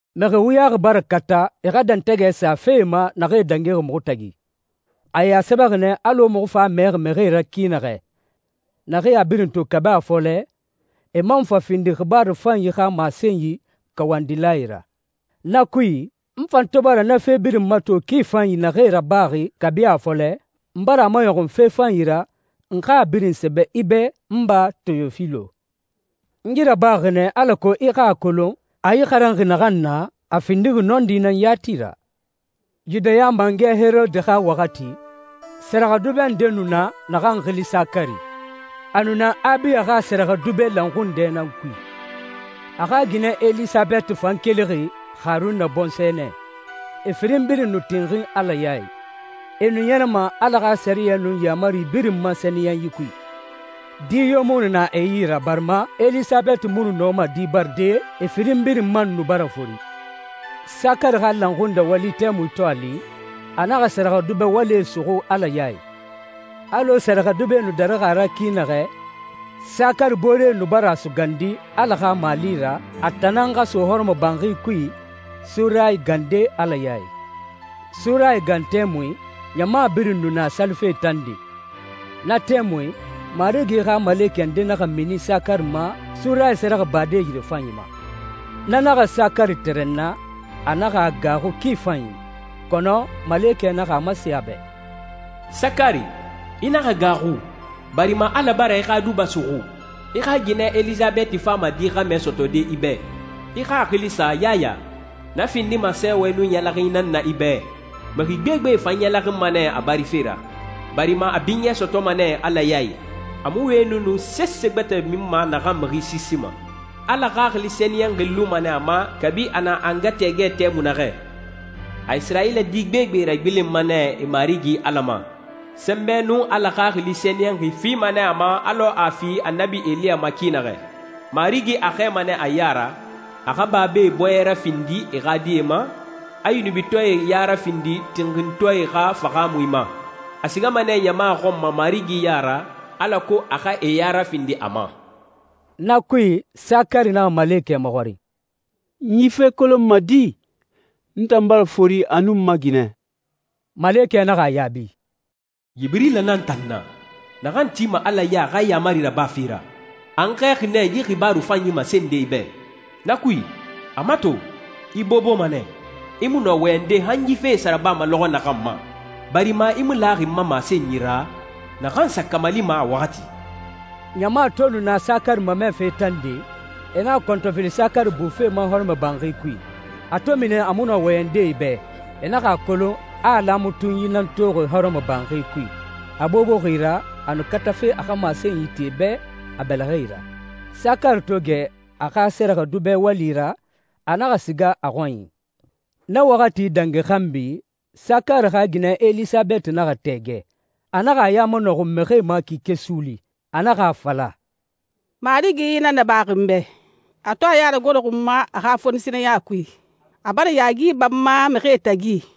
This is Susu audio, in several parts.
Mixi wuyaxi bara kata e xa dɛntɛgɛ sa fee ma naxee dangixi muxu tagi. E a sɛbɛxi nɛ alɔ muxu fan a mɛxi mixie ra ki naxɛ, naxee a birin to kabi a fɔlɛ, e man fa findi xibaaru fanyi xa masenyi kawandilae ra. Na kui, n fan to bara na fe birin mato ki fanyi naxee rabaxi kabi a fɔlɛ, n bara a maɲɔxun fe fanyi ra, n xa a birin sɛbɛ i bɛ, n ba Teyofilo. N yi rabaxi nɛ, alako i xa a kolon, a i xaranxi naxan na, a findixi nɔndi nan yati ra. Yudaya mangɛ Herode xa waxati, sɛrɛxɛdubɛ nde nu na naxan xili Sakari. A nu na Abiya xa sɛrɛxɛdubɛ lanxundɛ nan kui. A xa ginɛ Elisabɛti fan kelixi Haruna bɔnsɔɛ nɛ. E firin birin nu tinxin Ala ya i. E nu ɲɛrɛma Ala xa sɛriyɛ nun yaamari birin ma sɛniyɛnyi kui. Di yo mu nu na e yi ra barima Elisabɛti mu nu nɔma di baride, e firin birin man nu bara fori. Sakari xa lanxundɛ wali tɛmui to a li, a naxa sɛrɛxɛdubɛ walie suxu Ala ya i. Alɔ sɛrɛxɛdubɛe nu darixi a ra ki naxɛ, Sakari booree nu bara a sugandi Ala xa mali ra, a tan nan xa so hɔrɔmɔbanxi kui surayi gande Ala ya i. Surayi gan tɛmui, ɲama birin nu na salife tande. Na tɛmui, Marigi xa malekɛ nde naxa mini Sakari ma surayi sɛrɛxɛbade yirefanyi ma. Na naxa Sakari tɛrɛnna, a naxa a gaaxu ki fanyi. Kɔnɔ malekɛ naxa a masen a bɛ, «Sakari, i naxa gaaxu, barima Ala bara i xa duba suxu. I xa ginɛ Elisabɛti fama di xɛmɛ sɔtɔde i bɛ. I xa a xili sa Yaya. Na findima sɛɛwɛ nun ɲɛlɛxinyi nan na i bɛ, mixi gbegbe fan ɲɛlɛxinma nɛ a barife ra, barima a binyɛ sɔtɔma nɛ Ala ya i. A mu wɛni nun sese gbɛtɛ minma naxan mixi siisima. Ala Xaxili Sɛniyɛnxi luma nɛ a ma kabi a na a nga tɛɛgɛ tɛmui naxɛ. A Isirayila di gbegbe ragbilenma nɛ e Marigi Ala ma. Sɛnbɛ nun Ala Xaxili Sɛniyɛnxi fima nɛ a ma alɔ a fi Annabi Eliya ma ki naxɛ. Marigi a xɛɛma nɛ a ya ra, a xa babae bɔɲɛ rafindi e xa die ma, a yunubitɔɛe ya rafindi tinxintɔɛe xa fahaamui ma. A sigama nɛ ɲama xɔn ma Marigi ya ra alako a xa e ya rafindi a ma.» Na kui, Sakari naxa malekɛ maxɔrin, «N yi fe kolonma di? N tan bara fori a nun n ma ginɛ.» Malekɛ naxa a yaabi, «Yibirila nan n tan na, naxan tima Ala ya i a xa yaamari rabafe ra. A n xɛɛxi nɛ yi xibaaru fanyi masende i bɛ. Na kui, a mato, i boboma nɛ, i mu nɔ wɔyɛnde han yi fee sa rabama lɔxɔ naxan ma, barima i mu laxi n ma masenyi ra, naxan sa kamalima a waxati.» Ɲama to nu na Sakari mamɛfe tande, e naxa kɔntɔfili Sakari bufe ma hɔrɔmɔbanxi kui. A to mini a mu nɔ wɔyɛnde e bɛ, e naxa a kolon a a laamatunyi nan toxi hɔrɔmɔbanxi kui. A boboxi ra a nu katafe a xa masenyi ti e bɛ a bɛlɛxɛe ra. Sakari to gɛ a xa sɛrɛxɛdubɛ wali ra, a naxa siga a xɔnyi. Na waxati dangi xanbi, Sakari xa ginɛ Elisabɛti naxa tɛɛgɛ. A naxa a ya manɔxun mixie ma kike suuli. A naxa a fala, «Marigi yi nan nabaxi n bɛ, a to a ya ragoroxi n ma a xa fonisireya kui! A bara yaagi ba n ma, mixie tagi.»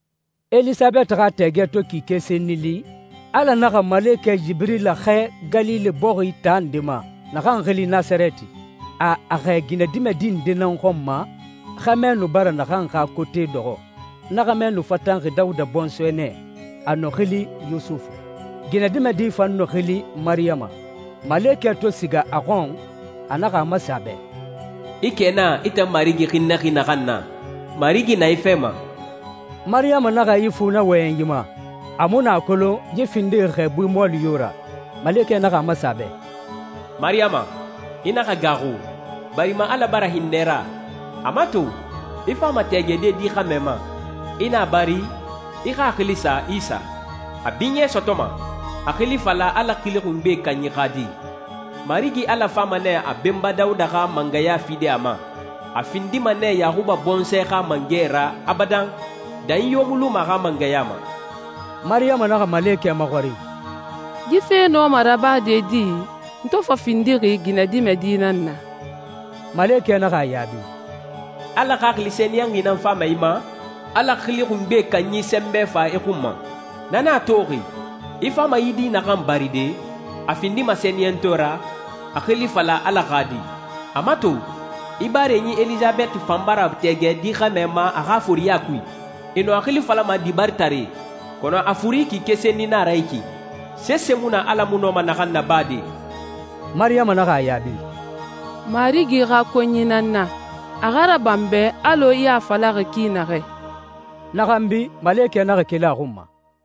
Elisabɛti xa tɛɛgɛ to kike senni li, Ala naxa malekɛ Yibirila xɛɛ Galile bɔxi taa nde ma, naxan xili «Nasarɛti». A a xɛɛ ginɛdimɛdi nde nan xɔn ma, xɛmɛ nu bara naxan xa kote dɔxɔ. Na xɛmɛ nu fatanxi Dawuda bɔnsɔɛ nɛ, a nu xili Yusufu. Ginɛdimɛdi fan nu xili Mariyama. Malekɛ to siga a xɔn, a naxa a masen a bɛ, «I kɛna, i tan Marigi hinnɛxi naxan na. Marigi na i fɛ ma!» Mariyama naxa ifu na wɔyɛnyi ma. A mu nu a kolon yi findixi xɛɛbui mɔɔli yo ra. Malekɛ naxa a masen a bɛ, «Mariyama, i naxa gaaxu, barima Ala bara hinnɛ i ra. A mato, i fama tɛɛgɛde di xɛmɛ ma. I na a bari, i xa a xili sa Isa. A binyɛ sɔtɔma, a xili fala Ala Xili Xungbe Kanyi xa Di. Marigi Ala fama nɛ a benba Dawuda xa mangɛya fide a ma. A findima nɛ Yaxuba bɔnsɔɛ xa mangɛ ra abadan, danyi yo mu luma a xa mangɛya ma.» Mariyama naxa malekɛ maxɔrin, «Yi fe nɔma rabade di, n to fa findixi ginɛdimɛdi nan na?» Malekɛ naxa a yaabi, «Ala Xaxili Sɛniyɛnxi nan fama i ma, Ala Xili Xungbe Kanyi sɛnbɛ fa i xun ma. Na nan a toxi, i fama yi di naxan baride, a findima sɛniyɛntɔɛ ra, a xili fala Ala xa Di. A mato, i barenyi Elisabɛti fan bara tɛɛgɛ di xɛmɛ ma a xa foriɲa kui. E nu a xili falama dibaritare, kɔnɔ a furi kike senni nan a ra yi ki. Sese mu na Ala mu nɔma naxan nabade.» Mariyama naxa a yaabi, «Marigi xa konyi nan n na. A xa raba n bɛ alɔ i a falaxi ki naxɛ.» Na xanbi, malekɛ naxa keli a xun ma.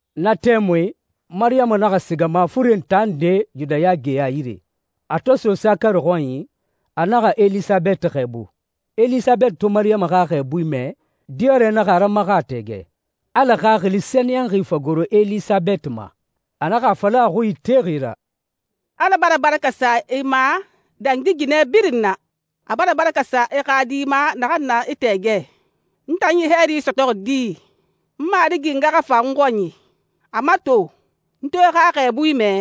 Na tɛmui Mariyama naxa siga mafuren taa nde Yudaya geya yire. A to so Sakari xɔnyi, a naxa Elisabɛti xɛɛbu. Elisabɛti to Mariyama xa xɛɛbui mɛ, diyɔrɛ naxa a ramaxa a tɛɛgɛ, Ala Xaxili Sɛniyɛnxi fa goro Elisabɛti ma. A naxa a fala a xui itexi ra, «Ala bara baraka sa i ma dangi ginɛ birin na, a bara baraka sa i xa di ma naxan na i tɛɛgɛ. N tan yi hɛɛri sɔtɔxi di, n Marigi nga xa fa n xɔnyi? A mato, n to i xa xɛɛbui mɛ,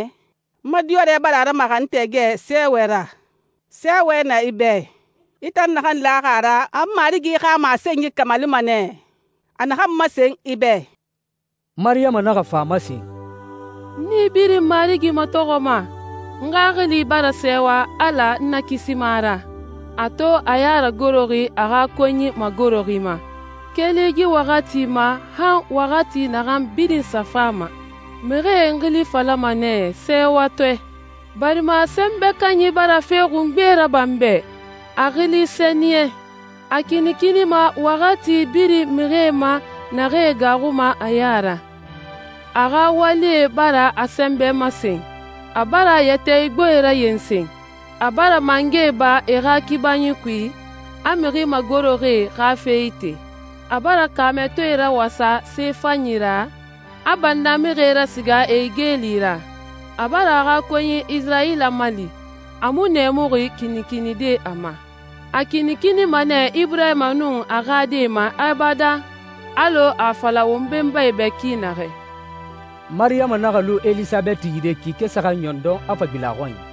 n ma diyɔrɛ bara a ramaxa n tɛɛgɛ sɛɛwɛ ra. Sɛɛwɛ na i bɛ, i tan naxan laxi a ra a Marigi xa masenyi kamalima nɛ, a naxan masen i bɛ.» Mariyama naxa fa a masen, «N nii birin Marigi matɔxɔma! N xaxili bara sɛɛwa Ala n Nakisima ra, a to a ya ragoroxi a xa konyi magoroxi ma. Keli yi waxati ma han waxati naxan birin sa fama, mixie n xili falama nɛ ‹sɛɛwatɔɛ›, barima Sɛnbɛ Kanyi bara fe xungbee raba n bɛ. A xili sɛniyɛn. A kinikinima waxati birin mixie ma, naxee gaaxuma a ya ra. A xa walie bara a sɛnbɛ masen. A bara yɛtɛ igboe rayensen. A bara mangɛe ba e xa kibanyie kui, a mixi magoroxie xa fe ite. A bara kaamɛtɔɛe rawasa se fanyi ra, a bannamixie rasiga e yi igeli ra. A bara a xa konyi Isirayila mali, a mu nɛɛmuxi kinikinide a ma. A kinikinima nɛ Iburahima nun a xa die ma abadan, alɔ a a fala won benbae bɛ ki naxɛ.» Mariyama naxa lu Elisabɛti yire kike saxan ɲɔndɔn, a fa gbilen a xɔnyi.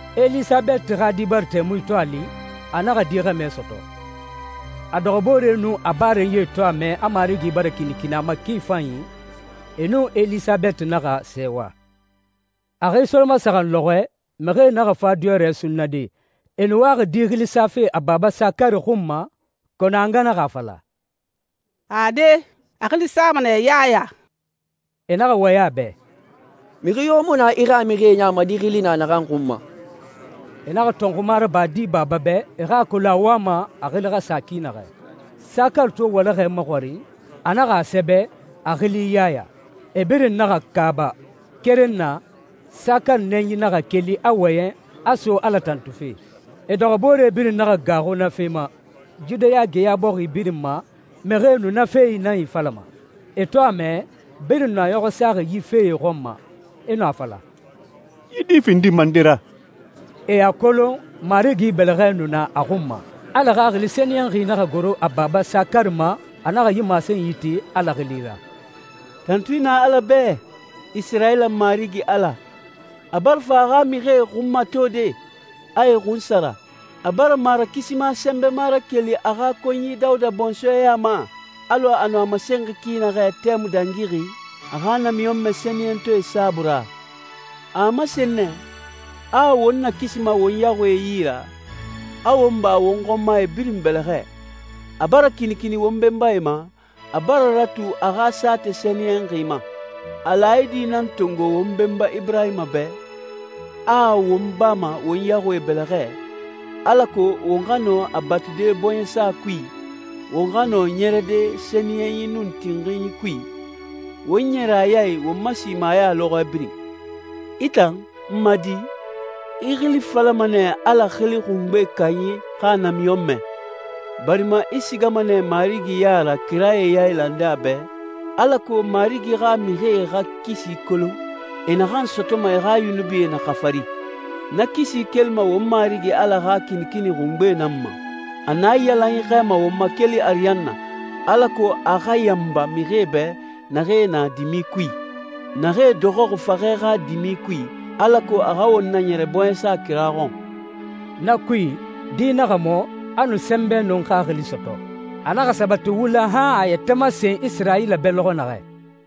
Elisabɛti xa di bari tɛmui to a li, a naxa di xɛmɛ sɔtɔ. A dɔxɔbooree nun a barenyie to a mɛ a Marigi bara kinikini a ma ki fanyi, e nun Elisabɛti naxa sɛɛwa. A xi solomasaxan lɔxɔɛ, mixie naxa fa diyɔrɛ sunnade. E nu waxi di xili safe a baba Sakari xun ma, kɔnɔ a nga naxa a fala, «Ade, a xili sama nɛ Yaya.» E naxa wɔyɛn a bɛ, «Mixi yo mu na i xa mixie ya ma yi xili na naxan xun ma.» E naxa tɔnxuma raba di baba bɛ e xa a kolon a wama a xili xa sa ki naxɛ. Sakari to walaxɛ maxɔrin, a naxa a sɛbɛ, «A xili Yaya.» E birin naxa kaaba. Keren na, Sakari nɛnyi naxa keli, a wɔyɛn, a so Ala tantufe. E dɔxɔboore birin naxa gaaxu na fe ma. Yudaya geya bɔxi birin ma, mixie nu na fee nan ifalama. E to a mɛ, birin nu e ɲɔxɔ saxi yi fee xɔn ma, e nu a fala, «Yi di findima nde ra?» E a kolon Marigi bɛlɛxɛ nu na a xun ma. Ala Xaxili Sɛniyɛnxi naxa goro a baba Sakari ma, a naxa yi masenyi ti Ala xili ra, «Tantui na Ala bɛ, Isirayila Marigi Ala! A bara fa a xa mixie xunmatode, a e xunsara. A bara Marakisima Sɛnbɛma rakeli a xa konyi Dawuda bɔnsɔɛ ya ma, alɔ a nu a masenxi ki naxɛ tɛmui dangixi, a xa namiɲɔnmɛ sɛniyɛntɔɛe saabui ra. A a masen nɛ, a a won nakisima won yaxuie yi ra, a won ba won xɔnmae birin bɛlɛxɛ. A bara kinikini won benbae ma, a bara ratu a xa saatɛ sɛniyɛnxi ma. A laayidi nan tongo won benba Iburahima bɛ, a a won bama won yaxuie bɛlɛxɛ, alako won xa nɔ a batude bɔɲɛsa kui, won xa nɔ ɲɛrɛde sɛniyɛnyi nun tinxinyi kui, won ɲɛrɛ a ya i won ma simaya lɔxɔɛ birin. I tan, n ma di, i xili falama nɛ Ala Xili Xungbe Kanyi xa Namiɲɔnmɛ, barima i sigama nɛ Marigi ya ra kirae yailande a bɛ, alako Marigi xa mixie xa kisi kolon, e naxan sɔtɔma e xa yunubie na xafari. Na kisi kelima won Marigi Ala xa kinikini xungbe nan ma. A naiyalanyi xɛɛma won ma keli ariyanna, alako a xa yanba mixie bɛ naxee na dimi kui, naxee dɔxɔxi faxɛ xa dimi kui, alako a xa won naɲɛrɛ bɔɲɛsa kira xɔn.» Na kui, di naxa mɔ, a nu sɛnbɛ nun xaxili sɔtɔ. A naxa sabati wula i han a a yɛtɛ masen Isirayila bɛ lɔxɔ naxɛ.